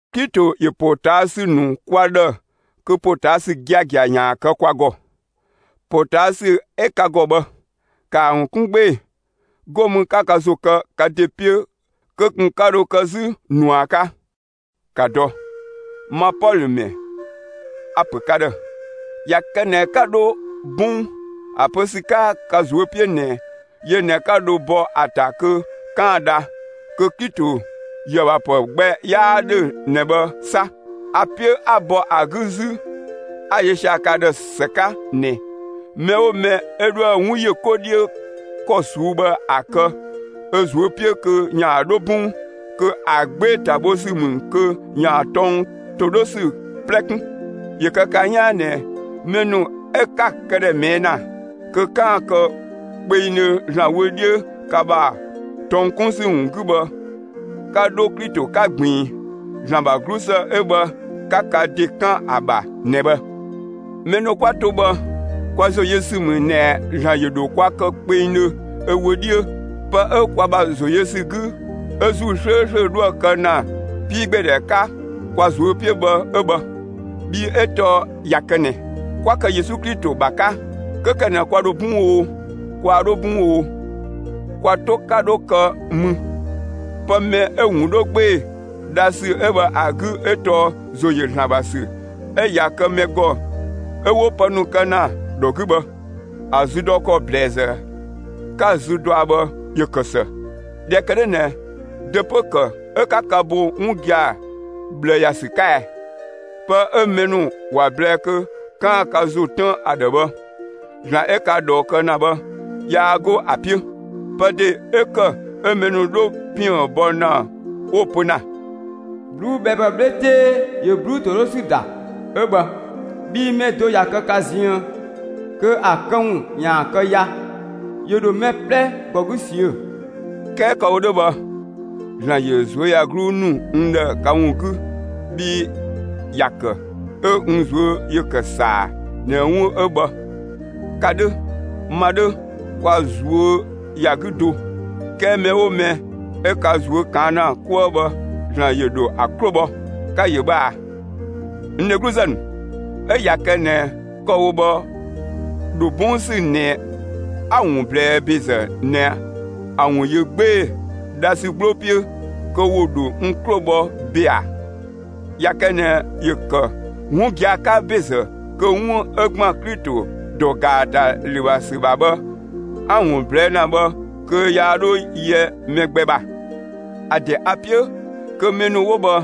Klito ‑yö ‑potaasü ‑nu kwa ‑dhë kö ‑potaasü giagia ‑yaan kë kwa ‑gɔ. ‑Potaasü 'ö ka ‑gɔ bhë, ‑kaa ‑wun 'kun 'gbee‑, 'go mü 'ka ka ‑zo kë ka ‑de 'piö kö ꞊kun 'ka dho kë 'zü ꞊nua 'ka. ‑Ka dɔ! Ma Pɔlö ‑mɛ a‑ ‑pö ka ‑dhë: ꞊Ya kë ꞊nɛ 'ka 'dho 'bɔng (‑a pö ‑sü 'ka ka ꞊zuö' 'piö ꞊nɛ yö ꞊nɛ 'ka dho bɔ ‑a ‑ta kö 'kaan‑ dha), kö Klito ‑yöë ‑bha ‑pë gbɛ 'yaa 'dhö ꞊nɛ bhë 'sa. A‑ 'piö 'a bɔ ‑a 'gü 'zü 'a‑ yö sia‑ ka ‑dhë ‑së 'ka ꞊nɛ: Mɛ 'oo mɛ 'ö 'dhoë‑ 'wun ‑yö 'ko 'dhiö ‑kɔ ꞊suu'‑ bhë ‑a kë ö ꞊zuö' 'piö kö ‑yaan 'dho 'bɔng, kö ‑a 'gbee‑ ‑ta bho ‑sü ‑mü kö ‑yaan tɔng ‑to 'dhö ‑sü 'plɛ 'kun. ‑Yö kë ka 'yaan ꞊nɛ mɛ ‑nu 'ö 'ka‑ këdhɛ ꞊mɛɛ' ‑na kö 'kaan‑ kë kpengdhö ‑Zlan wö 'dhiö ka ‑bha tɔng 'kun ‑sü ‑wun 'gü bhë, 'ka 'dho Klito 'ka ꞊gbiin; ‑Zlan ‑bha 'glusë 'ö bhë 'ka ka ‑de 'kan ‑a ‑bha ꞊nɛ bhë. Mɛ ‑nu 'kwa to bhë, kwa ‑zo yö ‑sü ‑mü ꞊nɛ ‑Zlan ‑yö ‑dho kwa kë kpengdhö ö wö 'dhiö. Pë 'ö kwa ‑bha ‑zo yö ‑sü 'gü 'ö ‑Zuu 'slööslö 'dhoë‑ kë ‑na 'piigbeedhɛ 'ka kwa ꞊zuö' 'piö bhë 'ö bhë. Bhii 'ö tɔɔ ꞊ya kë ꞊nɛ 'kwa kë Yesu Klito ‑bha 'ka, 'kö ‑kë ꞊nɛ kwa ‑dho 'bɔng oo, kwaa 'dho 'bɔng oo, kwa 'to 'ka 'dho kë mü: Pë mɛ 'ö‑ ‑wun 'dho 'gbee‑ dha ‑sü 'ö bhë ‑a 'gü 'ö tɔɔ ‑zo ‑yö ‑Zlan ‑bha ‑sü 'ö ꞊ya kë mɛ ‑gɔ 'ö 'wo pë ‑nu kë ‑na ‑dhɔ 'gü bhë. ‑A zü dɔ ‑kɔ ‑blɛɛzë 'ka‑ zü dɔa bhë, ‑yö ‑kë ‑së. ꞊Dhɛ ‑kë 'dhö ꞊nɛ dö 'pö‑ ‑kë 'ö 'ka ka bo 'wun gia‑ ꞊bhlë ‑ya ‑sü 'ka ɛ? Pë 'ö mɛ ‑nu ‑wa ꞊blɛɛ kö 'kaan‑ ka ‑zo tën ‑a ‑dhë bhë, ‑Zlan 'ö ka ꞊dhɔɔ kë ‑na bhë, yaa 'go ‑a 'piö. Pë ‑de 'ö ‑kë 'ö mɛ ‑nu 'dho ‑piën bɔ ‑na 'wo‑ pö ‑na: «꞊Bluubhɛɛpë 'bhle 'tee ‑yö ꞊bluu'‑ ‑to 'dhö ‑sü ‑da 'ö bhë.» (Bhii mɛ do ꞊ya kë ka ziën kö ‑a këwun ‑yaan kë ya; ‑yö ‑dho mɛ 'plɛ ‑gɔ 'gü ꞊siö'‑.) 'Kɛɛ kë‑ wo 'dhö bhë, ‑Zlan ‑yö ꞊zuöyagluu ‑nu n ‑dhë ka ‑wun 'gü bhii ‑ya ‑kë 'ö n ꞊zuö' ‑yö ‑kë ‑saa ꞊nɛ 'wun 'ö bhë, ka 'dhö, ma 'dhö, kwa ꞊zuö' ‑ya 'gü do. 'Kɛɛ mɛ 'oo mɛ 'ö ka ꞊zuö' ꞊kaan' ‑na 'kuë bhë, ‑Zlan ‑yö ‑dho ‑a 'klo bhɔ. Ka‑ ‑yö bhë ꞊a, n dhegluzë ‑nu; 'ö ꞊ya kë ꞊nɛ kë‑ wo bhë ‑dho 'bɔng ‑sü ꞊nɛ 'a‑ ‑wun ꞊blɛɛ ‑bezë ꞊nɛ ‑a ‑wun ‑yö 'gbee‑ dha ‑sü 'gbloo 'piö, kö ‑wo ‑dho n 'klo bhɔ ‑be ‑a? ꞊Ya kë ꞊nɛ ‑yö ‑kë 'wun gia‑ 'ka ‑bezë kö 'wun 'ö ‑gban Klito ‑dɔ ‑gaatalü ‑bha ‑sü ‑bha bhë 'a‑ ‑wun ꞊blɛɛ' ‑na bhë kö yaa 'dho yɛ mɛ gbɛ ‑bha. ‑A ‑de a‑ 'piö kö mɛ ‑nu 'wo bhë,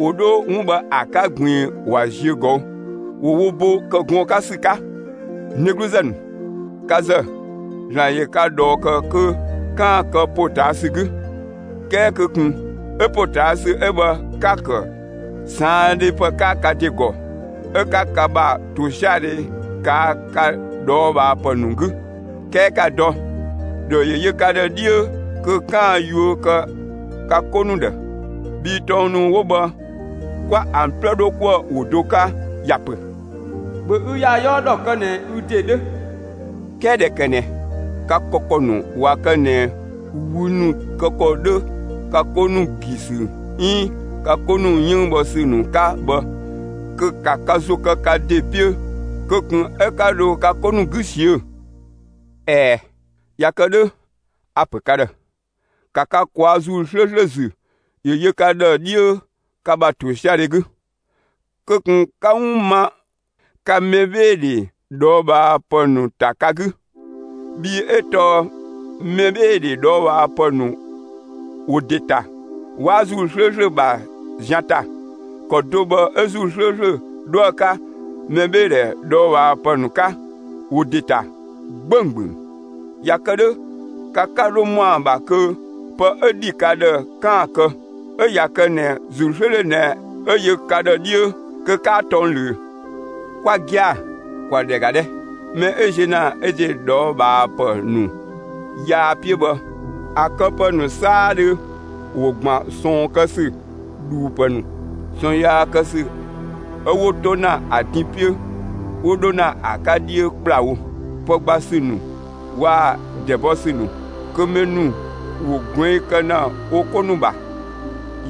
‑wo 'dho 'wun bhë ‑a 'ka ꞊gbiin ‑wa ziö ꞊gɔü', ‑wo wo bo ‑kë gɔɔn‑ 'ka ‑sü 'ka. N dhegluzë ‑nu, ka ‑zë, ‑Zlan ‑yö ka ꞊dhɔɔ ‑kë kö 'kaan‑ kë ‑potaasü 'gü. 'Kɛɛ kö ꞊kun 'ö ‑potaasü 'ö bhë 'ka‑ ‑kë ꞊saandhepë 'ka ka ‑de ‑gɔ 'ö 'ka ka ‑bha ‑tosiadhe ꞊kaa' ka ꞊dhɔɔbhaapë ‑nu 'gü. 'Kɛɛ ‑ka dɔ, ‑dhɔ ‑yö yö ka ‑dhë 'dhiö kö 'kaan‑ yuö kë ka 'ko ‑nu ‑dhë. Bhii tɔng ‑nu 'wo bhë 'kwa ‑an 'plɛ 'dho 'kuë‑ ‑wo do 'ka, ‑ya ‑pö: ‑Bhö ü ‑ya 'yɔɔ ‑dhɔ kë ꞊nɛ ü ‑de 'dhö. 'Kɛɛ ꞊dhɛ ‑kë ꞊nɛ ka kë ‑kɔ ‑nu ꞊wa kë ꞊nɛ wü ‑nu kë ‑kɔ 'dhö ka 'ko ‑nu ‑gi ‑sü 'iin ka 'ko ‑nu 'yënng bhɔ ‑sü ‑nu 'ka bhë, kö ‑ka ka ‑zo kë ka ‑de 'piö kö ꞊kun 'ö 'ka dho ka 'ko ‑nu 'gü ꞊siö'‑! ꞊Ɛɛ, ꞊ya kë 'dhö, a‑ ‑pö ka ‑dhë: ‑Ka ka ꞊kwaa'‑ ‑Zuu 'slööslö ‑zü ‑yö yö ka ‑dhë 'dhiö ka ‑bha ‑tosiadhe 'gü; kö ꞊kun 'ka 'wun ma ka mɛbheedhe ꞊dhɔɔbhaapë ‑nu ‑ta ka 'gü; bhii 'ö tɔɔ mɛbheedhe ꞊dhɔɔbhaapë ‑nu ‑wo ‑de ‑ta; 'waa ‑Zuu 'slööslö ‑bha zian ‑ta; ‑kɔ do bhë 'ö ‑Zuu 'slööslö 'dhoë‑ 'ka mɛbheedhe ꞊dhɔɔbhaapë ‑nu 'ka; ‑wo ‑de ‑ta 'gbönggböng. ꞊Ya kë 'dhö ka 'ka 'dho ‑mɔa ‑bha kö pë 'ö ‑dhi ka ‑dhë 'kaan‑ kë. 'Ö ꞊ya kë ꞊nɛ ‑Zuu 'slööslö ꞊nɛ 'ö yö ka ‑dhë 'dhiö, kö 'kaa tɔng ꞊löö. Kwa gia‑, ‑kwa ‑dhɛ ‑ga 'dhɛ! Mɛ 'ö ziö ‑na ö ‑de ꞊dhɔɔbhaapë ‑nu yaa 'piö bhë, ‑a këpë ‑nu 'saadhö ‑wo ‑gban ꞊sɔɔn kë ‑sü, ‑dhuupë ‑nu, ꞊sɔɔn yaa kë ‑sü 'ö 'wo 'to ‑na ‑a din 'piö 'wo 'dho ‑na ‑a 'ka 'dhiö ‑kplawo, pë gba ‑sü ‑nu waa‑ ‑dɛ bɔ ‑sü ‑nu; kö mɛ ‑nu ‑wo ꞊gluɛng' kë ‑na wo 'ko ‑nu ‑bha,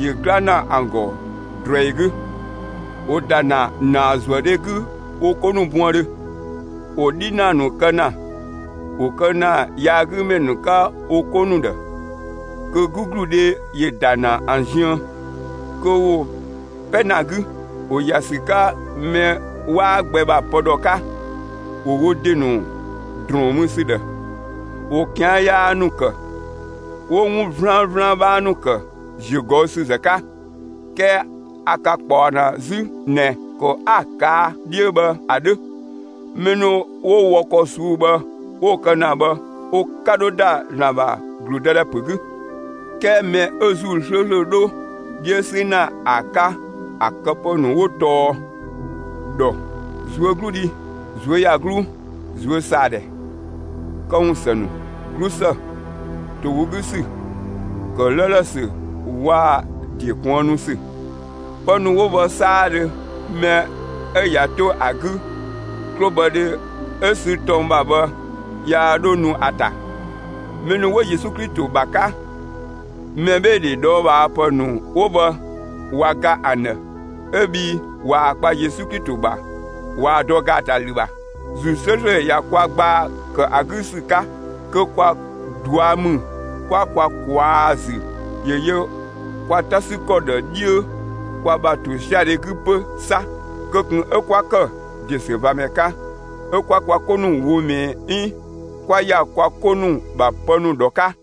‑yö 'gla ‑na ‑an ‑gɔ ꞊druɛi 'gü, ‑wo ‑da ‑na ‑naazuëdhe 'gü wo 'ko ‑nu buëndhö, ‑wo 'dhinaa ‑nu kë ‑na, ‑wo kë ‑na yaagümɛ ‑nu 'ka wo 'ko ‑nu ‑dhë; kö 'gügludhe ‑yö ‑da ‑na ‑an ziën kö ‑wo 'pɛ ‑na 'gü. ‑Wo ‑ya ‑sü 'ka mɛ 'waa gbɛ ‑bha pë ‑dhɔ 'ka; ‑wo wo ‑de ‑nu ‑drɔɔn mü ‑sü ‑dhë, ‑wo ꞊kian' yaa ‑nu ‑kë, 'wo 'wun 'vlanvlan 'bhaa ‑nu ‑kë ‑ziögɔüsüzë 'ka. 'Kɛɛ a ka ꞊kpaɔ ‑na 'zü ꞊nɛ ‑kɔ 'a‑ ꞊kaa' 'dhiö bhë ‑a 'dhö. Mɛ ‑nu 'wo wɔ ‑kɔ ꞊suu'‑ bhë, 'wo‑ kë ‑na bhë, wo 'ka 'dho ‑da ‑Zlan ‑bha ‑gludëdhɛ ‑pö 'gü. 'Kɛɛ mɛ 'ö ‑Zuu 'slööslö 'dho 'dhiö 'sü ‑na ‑a 'ka ‑a këpë ‑nu 'wo tɔɔ ‑dhɔ, ꞊zuögludhi, ꞊zuöyagluu, ꞊zuösaadhɛ, këwun ‑së ‑nu, 'glusë, ‑to ‑wo 'gü ‑sü, ‑kë 'lëëlë ‑sü waa‑ ‑de kuënnu ‑sü. Pë ‑nu 'wo bhë 'saadhö mɛ 'ö ꞊ya 'to ‑a 'gü, 'klobhɔdhe 'ö sü tɔng ‑bha bhë, yaa 'dhö nu ‑a ‑ta. Mɛ ‑nu 'wo Yesu Klito ‑bha 'ka, mɛbheedhe ꞊dhɔɔbhaapë ‑nu 'wo bhë ꞊wa ga ‑an ‑dhë 'ö bhii ꞊waa‑ kpa Yesu Klito ‑bha, ꞊waa‑ dɔ ‑gaatalü ‑bha. ‑Zuu 'slööslö ꞊ya kwa gbaa ‑kë ‑a 'gü ‑sü 'ka; kö kwa ꞊dua' ‑mü 'kwa kwa ꞊kwaa'‑ ‑zü ‑yö yö kwa 'ta ‑sü ‑kɔ ‑dhë 'dhiö kwa ‑bha ‑tosiadhe 'gü 'pö 'sa. Kö ꞊kun 'ö 'kwa ‑kë ‑desüvamɛ 'ka, 'ö 'kwa kwa 'ko ‑nu ꞊woo' ꞊mɛɛ 'iin 'ö 'kwa ‑ya kwa 'ko ‑nu ‑bha pë ‑nu ‑dhɔ 'ka.